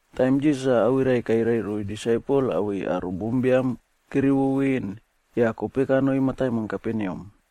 Taim Jisas awirai kairai roiy disaipel awei aro bombiam kerivo ven yah kope kanoi mataimon Kaperneam.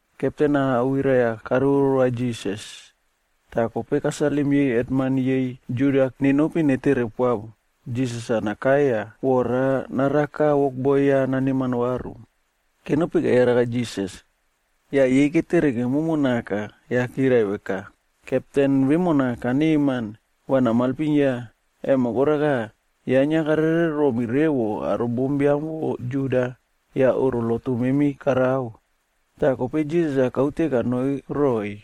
Kepten-a awirai-a karivo rova Jisas, tah kope kasalim yei hetman yei Juda nenopi netere poa Jisas nakai yah vora naraka wokboi ya naneman varu. Kenopi keyaraka Jisas, yah yei ketere kemomo naka yah kirai veka, “Kepten vemona kaneman, va namailpim ya, emo koraka, ya inia karere romi revo aro bombiam vo Juda yah oꞌro lotu memi karao.” Tah kope Jisas-a kaute kanoi roiy.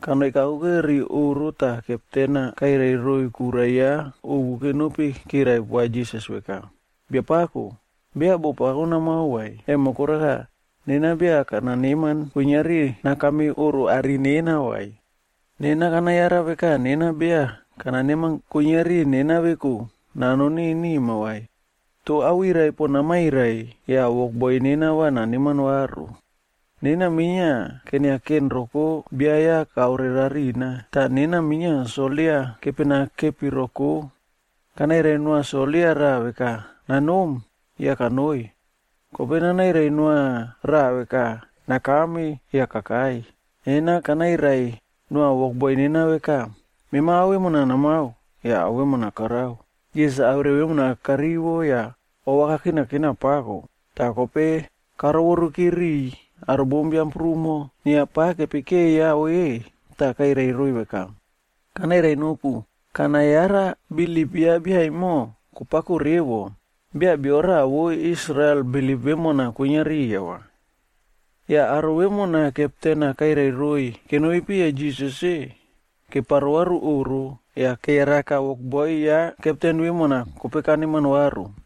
Kanoi kakuke ri oꞌro tah kepten-a kairai roiy kura ya ovu kenopi kirai poa Jisas veka, “Biapako, beya boꞌo pako namao vai, emo koraka, nena beya kana neman kuiniari nakame oꞌro are nena vai. Nena kana yara veka nena beya kana neman kuiniari nena veku nanoni nima vai. Toh awirai pon namairai yah wokboi nena va naneman varu. Nena minia keniaken roko bia ya kaore rarina. Tah nena minia soldia kepena kepi roko. Kanairai noa soldia raꞌa veka, ‘Nanom,’ yah kanoi. Kope nanairai noa raꞌa veka, ‘Nakame,’ yah kakai. Nena kanairai noa wokboi nena veka, ‘Mema ao vemo namao,’ yah ao vemona karao.” Jisas awirai vemona karivo yah ova kakinakina pako, tah kope karoworukire riꞌiy aro bombiam prumo inia pa kepekeya ve tah kairai roiy veka, “Kanairai nopu, kana yara bilip ya bia emo kopako revo, beya bio raꞌa vo Israel bilip vemona kwinia riya vai.” Yah aro vemona kepten-a kairai roiy kenopi piya Jisas-e, keparo varu oꞌro yah keyaraka wokboi ya kepten vemona kope kaneman varu.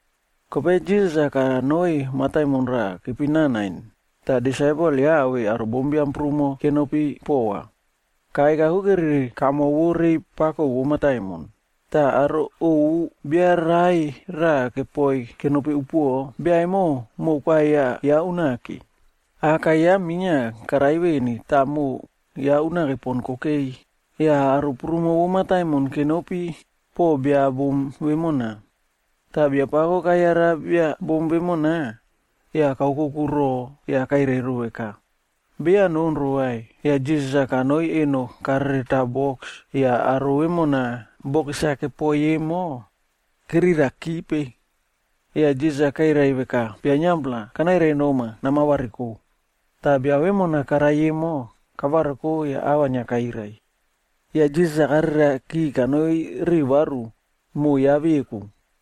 Kope Jisas-a kanoi mataimon raꞌa kepina Nain, tah disaipel ya awei aro bombiam prumo kenopi pova. Kakai kakuke ri kamo vo rei pako vo mataimon, tah aro ovu bia rai raꞌa kepoi kenopi upuoꞌo. Bia emo moꞌo koavia ya unake. Aka ya minia karai veni tah moꞌo ya unake pon kokei. Yah aro prumo vo mataimon kenopi poꞌo bia bom vemona. Tah Biapako kayara bia bom vemona, yah kaokoku roꞌo yah kairai ro veka, “Beya nonro vai.” Yah Jisas-a kanoi eno karereta boks yah aro vemona boks-a kepoi emo kerirakipe. Yah Jisas-a kairai veka, “Bia niampla, kanairai noma, nama variko!” Tah bia vemona karai emo, kavariko yah ava inia kairai. Yah Jisas-a kareriaki kanoi ri varu moꞌo ya veku.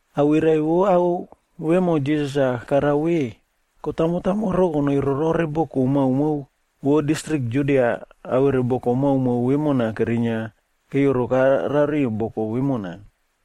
Awirai vo ao vemo Jisas-a karao ve, kotamo tamoro konoi rorore boko maomao vo distrik Judia awere boko maomao vemo kerinia keyoroka rariu boko vemona.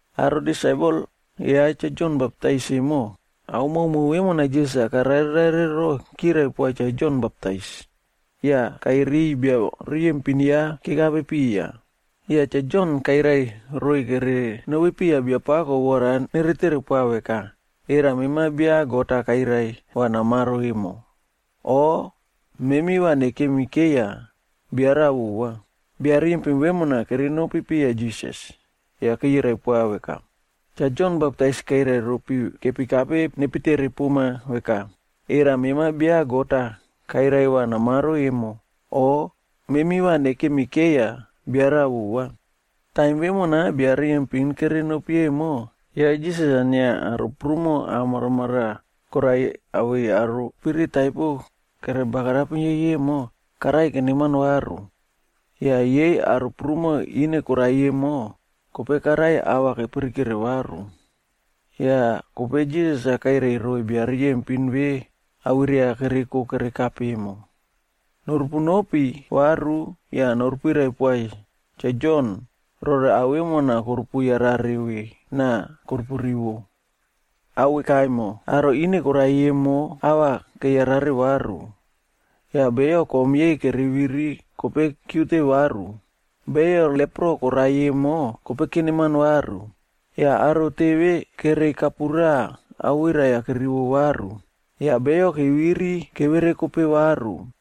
Aro disaipel ya Cha Jon Baptaisa emo, ao maomao vemona Jisas-a karare rare ero, kirai poa Cha Jon Baptais, yah kairiy bia riyempin ya kerekape piya. Yah Cha Jon kairai roiy kere nopi piya Biapako vora nere tere poa veka, “Era mema bia God-a kairai va namaro emo, o memi va nekemi keiya bia raꞌa vova?” Bia riyempin vemona kerenopi piya Jisas, yah keyirai poa veka, “Cha Jon Baptais kairai ropi kepikape nepi tere poma veka, ‘Era mema bia God-a kairai va namaro emo, o memi va nekemi keiya bia raꞌa vova?’” Taim vemona bia riyempin kere nonopi emo, ya Jisas-a inia aro prumo ah maramaraꞌa koraiy awei aro spirit taipo kere bagarapim yei emo, karaiy keneman varu. Yah yei aro prumo ine koraiy emo, kope karaiy ava kepirikere varu. Yah kope Jisas-a kairai roiy bia riyempin ve awirai-a kereko kerekape emo, “Norupu nopi varu yah noru pirai poa Cha Jon rore ao vemona korupu yarare ve na korupu rivo. Ao vekaemo: aro ine koraiy emo ava keyarare varu, yah beyo kom yei kere viri kope kiute varu, beyo lepro koraiy emo kope keneman varu, yah aro teve kereiy kapura awirai-a kerivo varu, yah beyo keviri keverekope varu,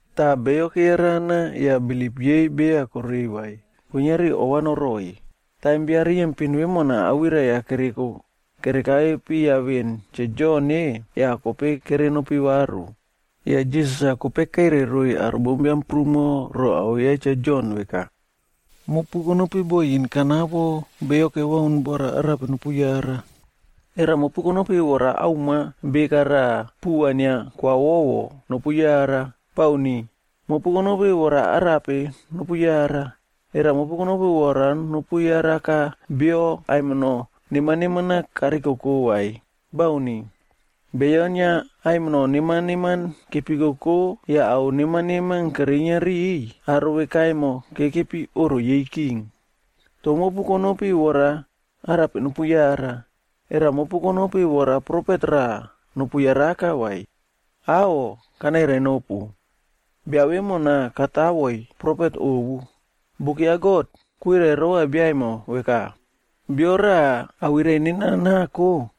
Tah beyo keyarana yah bilip yei beya korei vai, kuiniari ova noroiy.” Taim bia riyempin vemona awirai-a kereko kere kape piya veꞌen Cha Jon-e, yah kope kere nopi varu. Yah Jisas-a kope kairai roiy aro bombiam prumo ro ao ya Cha Jon veka, “Mopu konopi bo yin kanapo beyo kebaun vora arape nopu yara? Era mopu konopi vora auma beka raꞌa puva inia koawowo, nopu yara vai? Bauni. Mopu konopi vora arape nopu yara? Era mopu konopi vora nopu yaraka bio aimino neman neman-a karikoko vai? Bauni. Beyo inia aimino neman neman kepikoko yah ao neman neman kerinia riꞌiy, aro veka emo kekepi oꞌro yei king. Toh mopu konopi vora arape nopu yara? Era mopu konopi vora profet raꞌa nopu yaraka vai? Aꞌho! Kanairai nopu, bia vemona katawoiy profet ovu. Buk ya God kwirai rova bia emo veka, ‘Bio raꞌa awirai nena nako,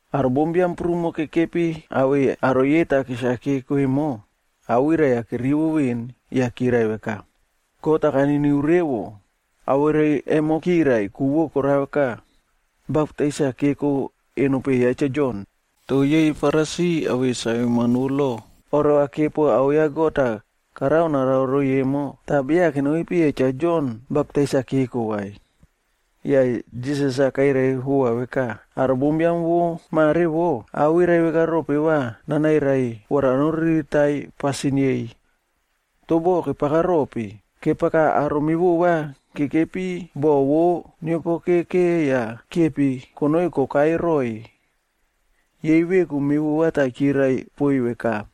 Aro bombiam prumo kekepi awei aro yei takis-a keko emo, awirai-a kerivo veꞌen yah kirai veka, “God-a kaniniu revo.” Awirai emo kirai, ku vo koraka, baptais-a keko eno peꞌe ya Cha Jon. Toh yei Farisi awei saveman vo lo oreva kepo ao ya God-a karao narao roiy emo, tah beya kenopi piya Cha Jon baptais-a keko vai. Yah Jisas-a kairai vova veka, “Aro bombiam vo mare wo, awirai vekarope va nanairai vora noriritaiy pasin yei? Toh boh kepaka rope? Kepaka aro mevova kekepi boꞌo vo neopokeke yah kiepi konoi kokai roiy yei veku mevova tah kirai poiy veka,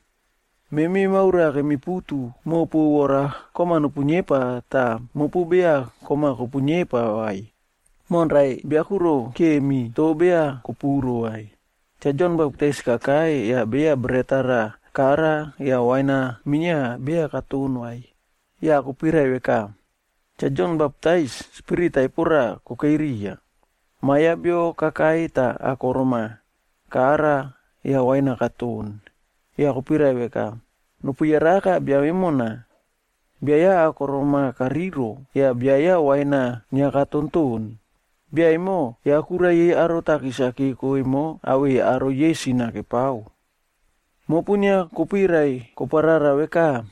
‘Memi maura kemiputu mopu vora kom-a nopu niepa tah mopu beya kom-a kopuniepa vai, monrai bia kuro kiemi, toh beya kopuro vai.’ “Cha Jon Baptais kakai yah beya bret-a raꞌa kara yah wain-a minia beya katon vai, yah kopirai veka, ‘Cha Jon Baptais, spirit taipo raꞌa kokei riya.’ Ma Biam ya Bio kakai tah akorom-a kara yah wain-a katon, yah kopirai veka, ‘Nopu yaraka bia vemona, bia ya akorom-a kariro yah bia ya wain-a inia katontoꞌon. Bia emo, ya kura yei aro takis-a keko emo awei aro yei sin-a kepao.’ Mopu inia kopuirai koparara veka,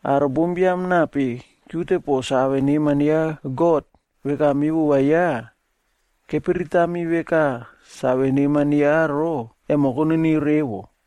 aro bombiam nape kiute poꞌo save neman ya God veka mevova ya, kepiritami veka save neman ya ero, emo koniniu revo.”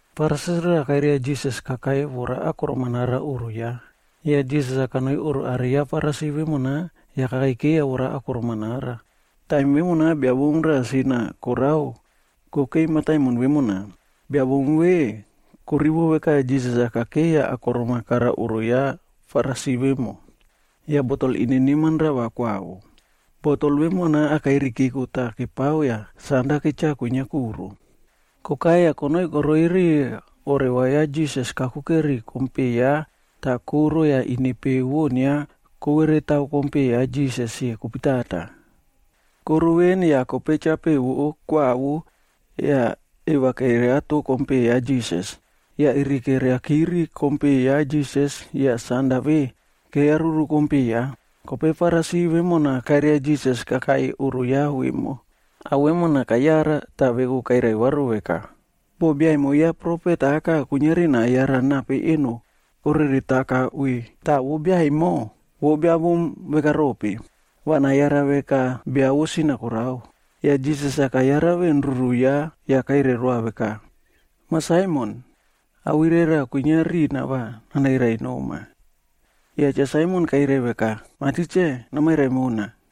Farisi raꞌa kairia Jisas-a kakai vora akorom-a nara riya oꞌro ya. Yah Jisas-a kanoi oꞌro are ya Farisi vemona yah kakeiyo vora akorom-a nara. Taim vemona bia bom raꞌa inia sin-a korao kokei mataimon vemona. Bia bom vemo korivo veka Jisas-a kakei yah akorom-a kara oꞌro ya Farisi vemo. Yah botol ine neman rava koawo. Botol vemona akairi keko tah kepao yah sanda ketcha kwinia kuro. Kokai yah konoi koroi riya oreva ya Jisas kakuke ri kom peꞌe ya tah koro yah ine pe vo inia koveretao kom peꞌe ya Jisas-e kopitata. Koro veꞌen yah kope chapeꞌe vo kwawo yah eiya keriato kom peꞌe ya Jisas, yah iri keiyakiri kom peꞌe ya Jisas yah sanda ve keyaruru kom peꞌe ya. Kope Farisi vemona kairia Jisas kakai oꞌro ya vemo, ao vemona kayara tah ya veku kairai varuvaru veka, “Boh bia emo ya profet aka kuiniari nayara nape eno koreretaka ve, tah vo bia emo, vo biabom vekarope. Va nayara veka bia vo sin-a korao.” Yah Jisas-a kayara veꞌen ruru ya yah kairai roa veka, “Mah Saimon, awirai raꞌa kwinia rina va nanairai noma.” Yah Cha Saimon kairai veka, “Mah Tikse, namairai mona.”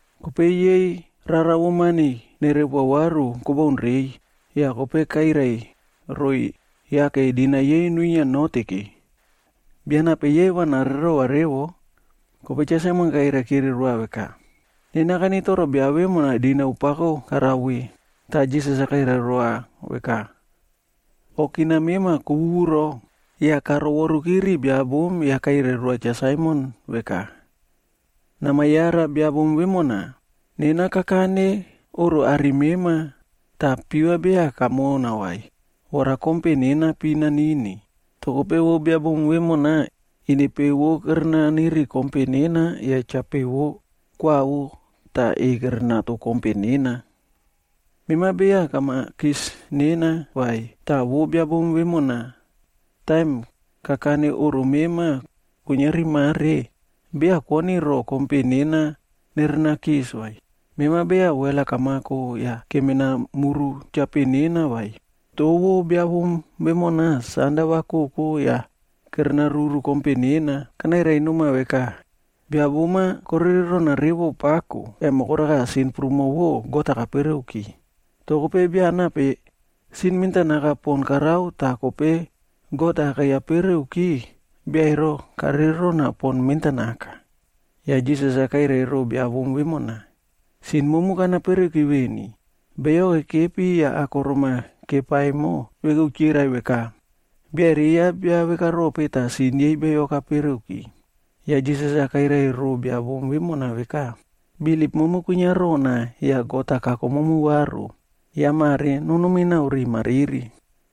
Kope yei rara vo mani nerepoa varu kobaun reiy. Yah kope kairai roiy yake dinau yei nuinia noteke. Bia nape yei va narererova revo?” Kope Cha Saimon kairai kire roa veka, “Nena kanitoro bia vemona dinau pako karao ve.” Tah Jisas-a kairai veka, “Okina mema kowuwuro.” Yah karovoruki ri bia bom yah kairai roa Cha Saimon veka, “Nama yara bia bom vemona? Nena kakane oꞌro are mema, tah piva beya kamona vai, vora kompe nena pi nanini, toh kope vo bia bom vemona ine pe vo kere naniri kompe nena yah chapeꞌe vo koawo tah eꞌei kerenato kompe nena. Mema beya kama kis nena vai, toh vo bia bom vemona, taim kakane oꞌro mema kuiniari mare, beya kwoni ro kompe nena nerena kis vai. Mema beya wel-a kamako yah kemena muru cha nena vai, toh vo bia bom vemona sanda va koko yah kere naruru kompe nena. Kanairai noma veka, bia bom-a korere rona revo pako, emo koraka sin prumo vo God-a kapereuki. Toh kope bia nape sin mentanaka pon karao tah kope God-a keyapereuki, bia ero karere rona pon mentanaka.” Yah Jisas-a kairai ro bia bom vemona, “Sin momu kana pereki veni.” Beyo kekepi yah akorom-a kepa emo veku kirai veka, “Biaere ya bia vekarope tah sin yei beyo kapereuki?” Yah Jisas-a kairai ro bia bom vemona veka, “Bilip momu kwinia rona yah God-a kako momu varu. Yah mare nonom naꞌao riꞌi mariri.”